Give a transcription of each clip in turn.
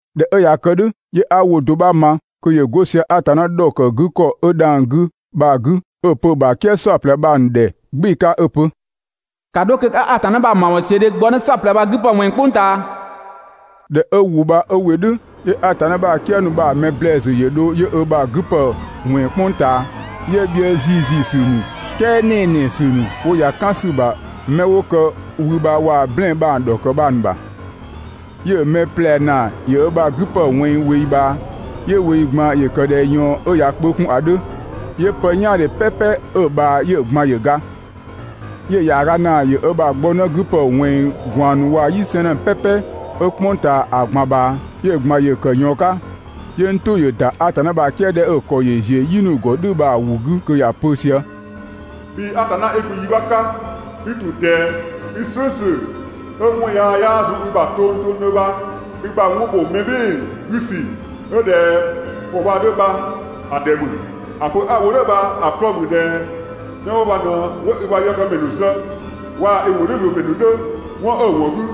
꞊Dhɛ 'ö ꞊ya kë "dhʋ̈, 'yö 'a ‑wʋ do 'bha ma kö ‑yö 'go sië Atanna ‑dhɔkëgükɔ 'ö dhang‑ 'gü bha‑ 'gü 'ö‑ pö‑ ‑bha "kië "saɔplɛ bha‑ ‑nu ‑dhɛ "gbɩɩ‑ 'ka 'ö‑ pö: «‑Ka 'dho kö 'ka Atanna ‑bha ‑mawɔnsiödhe gbɔnë "saɔplɛ bha‑ 'gü ‑pë ꞊wɛnng "kpʋng ꞊taa.» ꞊Dhɛ 'ö ‑wʋ bha 'ö ‑wɩ "dhʋ̈, 'yö Atanna ‑bha "kië ‑nu bha‑ mɛ ‑blɛɛsü ‑yö dho 'yö ö ‑bha 'gü ‑pë ꞊wɛnng "kpʋng ꞊taa. 'Yö bhië ‑ziiziisü ‑nu, "kɛɛ ‑nɛnɛsü ‑nu 'wo ‑ya "kan ‑sü ‑bha mɛ 'wo kë wü bha waa‑ "blɛɛn‑ bha‑ ‑dhɔkë bha‑ ‑nu ‑bha. 'Yö‑ mɛ ꞊plɛ ‑naa ‑yö ö ‑bha 'gü ‑pë ꞊wɛnng ꞊weeyi ꞊bhaa. 'Yö ꞊weeyi ꞊gban ‑yö ‑kë ꞊dhɛ ꞊yɔɔn 'ö ꞊ya kpö 'kun ‑a 'dhö, 'yö pë "yaandhe "pɛpɛ 'ö‑ ꞊bhaa 'yö‑ ꞊gban ‑yö ga. 'Yö‑ ‑yaaga ‑naa ‑yö ö ‑bha 'gbɔnë 'gü ‑pë ꞊wɛnng ꞊gwaan ‑nu waa‑ "yi 'sɛɛnnë "pɛpɛ 'ö "kpʋng ꞊taa ‑a ꞊gban ꞊bhaa, 'yö‑ ꞊gban ‑yö ‑kë ꞊yɔɔn 'ka. 'Yö n "tʋ ‑yö ‑da Atanna ‑bha "kië 'dhɛ 'ö‑ ‑kɔ ‑yö ‑ziö "yi ‑nu ‑gɔ "dhʋ̈ bha‑ ‑wʋ 'gü kö ‑ya pö sië: «Bhii Atanna 'i gun yi 'bha 'ka, 'i ‑tun ꞊dɛɛ, 'ö 'i "slʋ̈ʋ̈slʋ̈, 'ö 'wɔn yaa 'yaa zun i ‑bha tongtongdhö bha i ‑bha 'wɔn ‑bho mɛ "bhɩɩ‑ 'gü ‑sü 'ö ꞊dhɛ ‑kɔ bha‑ 'dhö bha‑ ‑dhɛ ‑mü. ‑A pö 'a‑ wo "dhʋ̈ bha‑ 'klɔɔ‑ ‑mü ꞊dhɛ 'mɛ 'wo bha ꞊në 'wo i ‑bha yëkëmɛ ‑nu zë waa‑ i ‑wʋdhiʋ̈loomɛ ‑nu 'dhö, 'wɔn 'ö‑ ‑wɔn 'gü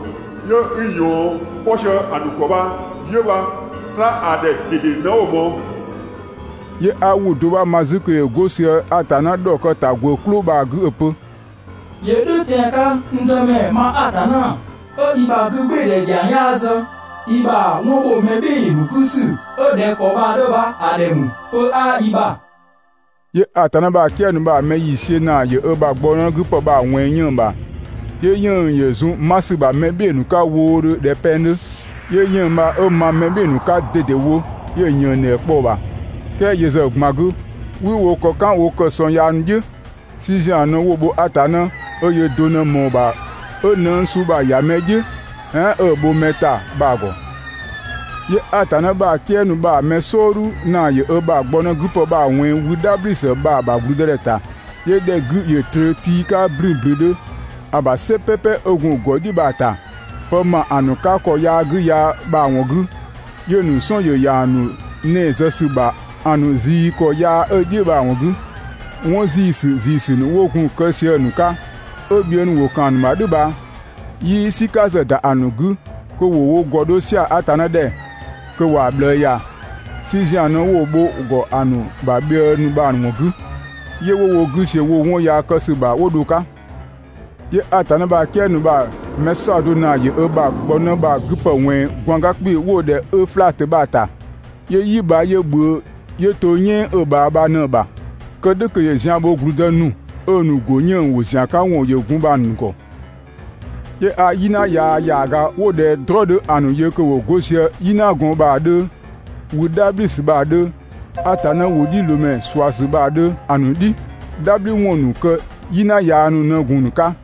'yö 'i ꞊yɔɔn 'kpɔ sië‑ ‑nu ‑gɔ bha 'yö bha, 'sa ‑a ‑dhɛ ꞊dede ꞊në 'wo‑ ꞊mɔɔ.» 'Yö 'a ‑wʋ do 'bha ma 'zü kö ‑yö 'go sië Atanna ‑dhɔkëtagwë "klʋ bha‑ 'gü 'ö‑ pö: «‑Yö "dhʋ̈ tɛan‑ 'ka, n Dëmɛ ma Atanna, 'ö i ‑bha 'gügbɩɩdhɛ ‑dhiang 'yaa zë, i ‑bha 'wɔn ‑bho mɛ "bhɩɩ‑ ‑nu 'gü ‑sü 'ö ꞊dhɛ ‑kɔ bha‑ 'dhö bha‑ ‑dhɛ ‑mü, pö 'yaa i ‑bha!» 'Yö Atanna ‑bha "kië ‑nu bha‑ mɛ ‑yiisiö ‑naa ‑yö ö ‑bha gbɔnë 'gü ‑pë bha‑ ꞊wɛnng 'yënng‑ ‑bha, 'Yö 'yënng‑ ‑yö zun 'ma ‑sü ‑bha mɛ "bhɩɩ‑ ‑nu 'ka wʋʋʋdhö ꞊dhɛ pɛng 'dhö. 'Yö 'yënng‑ bha 'ö ma mɛ "bhɩɩ‑ ‑nu 'ka ꞊dedewo 'yö‑ ‑yënngdhɛ kpɔ‑ ‑bha, "kɛɛ yö ‑zë ꞊gban 'gü, 'wii wo ‑kɔ "kan wo kë ‑sɔng yaa ‑nu "dhiʋ̈. "Si ‑zian ꞊në 'wo‑ bho Atanna 'ö yöö do ꞊në ꞊mɔɔ‑ ‑bha 'ö nëng suu bha‑ ‑ya mɛ "dhiʋ̈ "ɛɛn 'ö‑ bho mɛ ‑ta bha‑ ‑gɔ. 'Yö Atanna ‑bha "kië ‑nu bha‑ mɛ "sɔɔdhu ‑naa ‑yö ö ‑bha gbɔnë 'gü ‑pë bha‑ ꞊wɛnng wü "dhabhli ‑sü bha‑ ‑bha ‑gblüdëdhɛ ‑ta. 'Yö ‑dhɛ 'gü ‑yö ꞊tröö tii 'ka ‑blünblündhö ‑bha "sɛ "pɛpɛ 'ö gun‑ ‑gɔdhiʋ̈ bha‑ ‑ta. Pë ‑ma ‑a ‑nu 'ka ‑kɔ yaa 'gü yaa bha‑ ‑wɔn 'gü, 'yö‑ ‑nu "sɔn ‑yö ‑ya ‑a ‑nu 'nɛɛ‑ zë ‑sü bha‑ ‑nu ꞊zii ‑kɔ yaa 'ö‑ "dhiʋ̈ bha‑ ‑wɔn 'gü. 'Wɔn ‑ziisü ‑ziisü ‑nu 'wo gun kë sië‑ ‑nu 'ka, 'ö bhië ‑nu ‑wo ‑kan ‑a ‑nu ‑bha "dhʋ̈ bha 'yii "sika ‑zë ‑da ‑nu 'gü kö ‑wo wo ‑gɔ 'dho "sia‑ Atanna ‑dhɛ, kö ‑wa ꞊bhlëë ‑ya. "Si ‑zian ꞊në 'wo‑ bho‑ ‑gɔ ‑a ‑nu ‑bha bhië ‑nu bha‑ ‑wɔn 'gü, 'yö 'wo wo 'gü ‑siö woo‑ 'wɔn yaa kë ‑sü ‑bha 'wo dho‑ 'ka. 'Yö Atanna ‑bha "kië ‑nu bha‑ mɛ "saɔdo ‑naa ‑yö ö ‑bha gbɔnë bha‑ 'gü ‑pë ꞊wɛnng ꞊gwaanga 'kpii‑ 'wo‑ ‑dhɛ Öflatö bha‑ ‑ta. 'Yö "yi bha 'ö ꞊bhʋ̈ʋ̈ 'yö to "yɛɛn 'ö‑ ꞊bhaa bha ꞊në‑ ‑bha, kë "dhʋ̈ kö ‑yö zian bho ‑gblüdë ‑nu 'ö‑ ‑nu ‑go 'yënng‑ ‑wo ‑zian 'ka ‑wɔn ‑yö gun bha‑ ‑nu ‑gɔ. 'Yö 'a "yina yaa ‑yaaga 'wo ꞊dhɛ "tʋ̈ng 'dhö ‑a ‑nu yö kö ‑wo 'go sië wü "dhabhli ‑sü bha waa‑ Atanna ‑wʋdhiʋ̈loomɛ ꞊suasü bha‑ ‑nu "dhi. "Dhabhliwɔn ‑nu kë "yina yaa ‑nu ꞊në gun‑ ‑nu 'ka.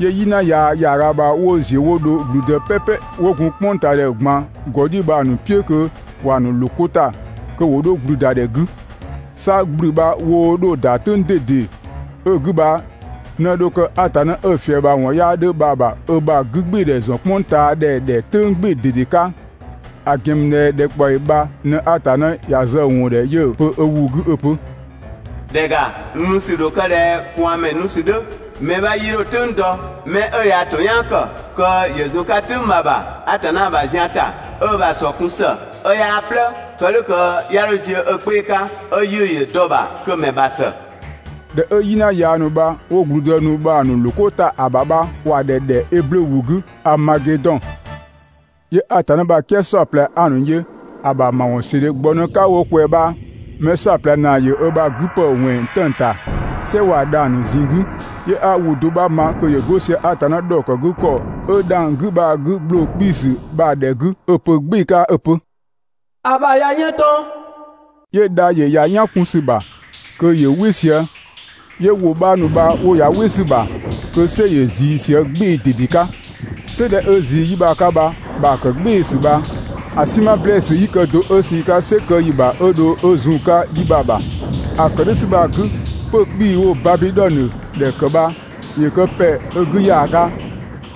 'Yö "yina yaa ‑yaaga bha 'wo ‑ziö 'wo dho ‑gblüdë "pɛpɛ 'wo gun "kpʋngtaadhɛ ꞊gban ‑gɔ "dhiʋ̈ bha‑ ‑nu "piʋ̈ kö ‑wa ‑nu ꞊loo 'ko ‑ta kö ‑wo 'dho ‑gblüdadhɛ 'gü. 'Sa ‑gblü bha woo 'dho‑ ‑da "tʋ̈ng ꞊dede 'ö‑ 'gü bha ꞊në dho kë Atanna 'ö‑ ‑fiëbhawɔn 'yaa 'dhö bha‑ ‑bha ö ‑bha 'gübgɩɩdhɛ ‑zɔn "kpʋngtaadhɛ ‑dhɛ "tʋ̈ng "gbɩɩ‑ ꞊dede 'ka. ‑A ‑gɛn ‑mü ꞊dhɛ ‑dhɛkpaɔyi bha ꞊në Atanna ‑ya zë‑ ‑wɔn ‑dhɛ 'yö‑ pö ö ‑wʋ 'gü 'ö‑ pö: «‑Dhɛ ‑ga, n nu ‑sü ‑dho kë ꞊dhɛ ꞊kwaanmɛ nu ‑sü 'dhö (mɛ 'bha 'yii 'dho‑ "tʋ̈ng dɔ)! 'Mɛ 'ö yaa‑ ‑to "yaan ‑kë kö ‑yö zun‑ 'ka "tʋ̈ng bha‑ ‑bha Atanna ‑bha zian ‑ta, 'ö ö ‑bha ‑sɔ kun ‑së 'ö 'yaa "blë, kë "dhʋ̈ kö 'ya 'dho ziö ö 'kpee‑ 'ka 'ö 'yiʋ̈‑ ‑yö dɔ‑ ‑bha, kö‑ ‑mɛ ‑bha ‑së.» ‑Dhɛ 'ö "yina yaa ‑nu bha 'wo ‑gblüdë ‑nu bha‑ ‑nu ꞊loo 'ko ‑ta ‑a ‑bha bha ‑wa ‑dhɛ ‑dhɛ eblö ‑wʋ 'gü Aamagedɔn. 'Yö Atanna ‑bha "kië "saɔplɛ 'a‑ ‑nu yö ‑a ‑bha ‑mawɔnsiödhe gbɔnë 'ka wo ꞊kwɛɛ‑ bha‑ mɛ "saɔplɛ ‑naa ‑yö ö ‑bha 'gü ‑pë ꞊wɛnng 'tëng‑ ‑ta "sɛ waa‑ dhang‑ ‑nu ꞊zinng 'gü. 'Yö 'a ‑wʋ do 'bha ma kö ‑yö 'go sië Atanna ‑dhɔkëgükɔ 'ö dhang‑ 'gü bha‑ 'gü ‑gbloo 'kpiisü bha‑ ‑dhɛ 'gü 'ö‑ pö "gbɩɩ‑ 'ka 'ö‑ pö: «‑A ‑bha ꞊ya ꞊yën ꞊tɔn!» 'Yö dha ‑yö ‑ya "yan 'kun ‑sü ‑bha, kö ‑yö "wɩ sië, 'yö ‑wʋ 'bha ‑nu bha 'wo ‑ya "wɩ ‑sü ‑bha kö "sɛ ‑yö ꞊zii sië "gbɩɩ‑ ꞊dede 'ka. "Sɛ 'dhɛ 'ö ꞊zii 'yi bha‑ 'ka bha‑ ‑bha ‑kë "gbɩɩsü bha, ‑a "sinma ‑blɛɛsü 'yii kë do 'ö sü‑ 'ka "sɛ kë ‑yi ‑bha 'ö dho 'ö zun‑ 'ka 'yi bha‑ ‑bha. ‑A ‑kë "dhʋ̈ ‑sü bha‑ 'gü, 'pö‑ 'kpii‑ 'wo‑ Babidhɔnö ‑dhɛ ‑kë bha ‑yö kë ‑pɛ 'ö 'gü ‑yaaga,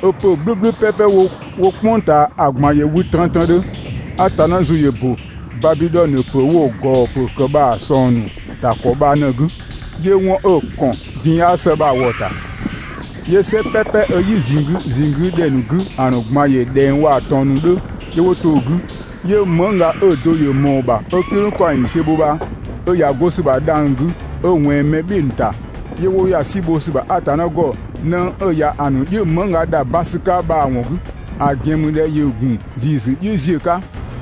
'ö 'pö‑ "gblʋ̈gblʋ̈ "pɛpɛ 'wo "kpʋng ꞊taa ‑a ꞊gban ‑yö wü trëntrëndhö. Atanna ‑zʋ ‑yö ‑bö Babidhɔnö ‑pö 'wo‑ ‑gɔɔ ‑pö ‑kë bha‑ ꞊sɔng ‑nu ‑ta ‑kɔ bha ꞊në‑ 'gü 'yö 'wɔn 'ö‑ ‑kɔn din 'yaa ‑së bha‑ ‑wɔ ‑ta. 'Yö "sɛ "pɛpɛ 'ö "yi ꞊zinng 'gü ꞊zinng 'gü ‑dhɛ ‑nu 'gü ‑a ꞊gban ‑yö ꞊dhɛng waa‑ ‑tɔn ‑nu 'dhö 'yö 'wo to‑ 'gü. 'Yö mëngga 'ö‑ do ‑yö ꞊mɔɔ‑ ‑bha 'ö "kidhʋng ‑kaɔng ‑yiisiö bho bha 'ö ‑ya 'go ‑sü ‑bha dhang‑ 'gü 'ö ꞊wɛnng mɛ "bhɩɩ‑ ‑nu ‑ta. 'Yö 'wo ‑ya "si bho ‑sü ‑bha Atanna ‑gɔ nëng 'ö ‑ya ‑a ‑nu "dhiʋ̈ mëngga ‑dha ban ‑sü 'ka bha‑ ‑wɔn 'gü, ‑a ‑gɛn ‑mü ꞊dhɛ ‑yö ‑gun ‑ziisü "dhiʋ̈ ziö 'ka.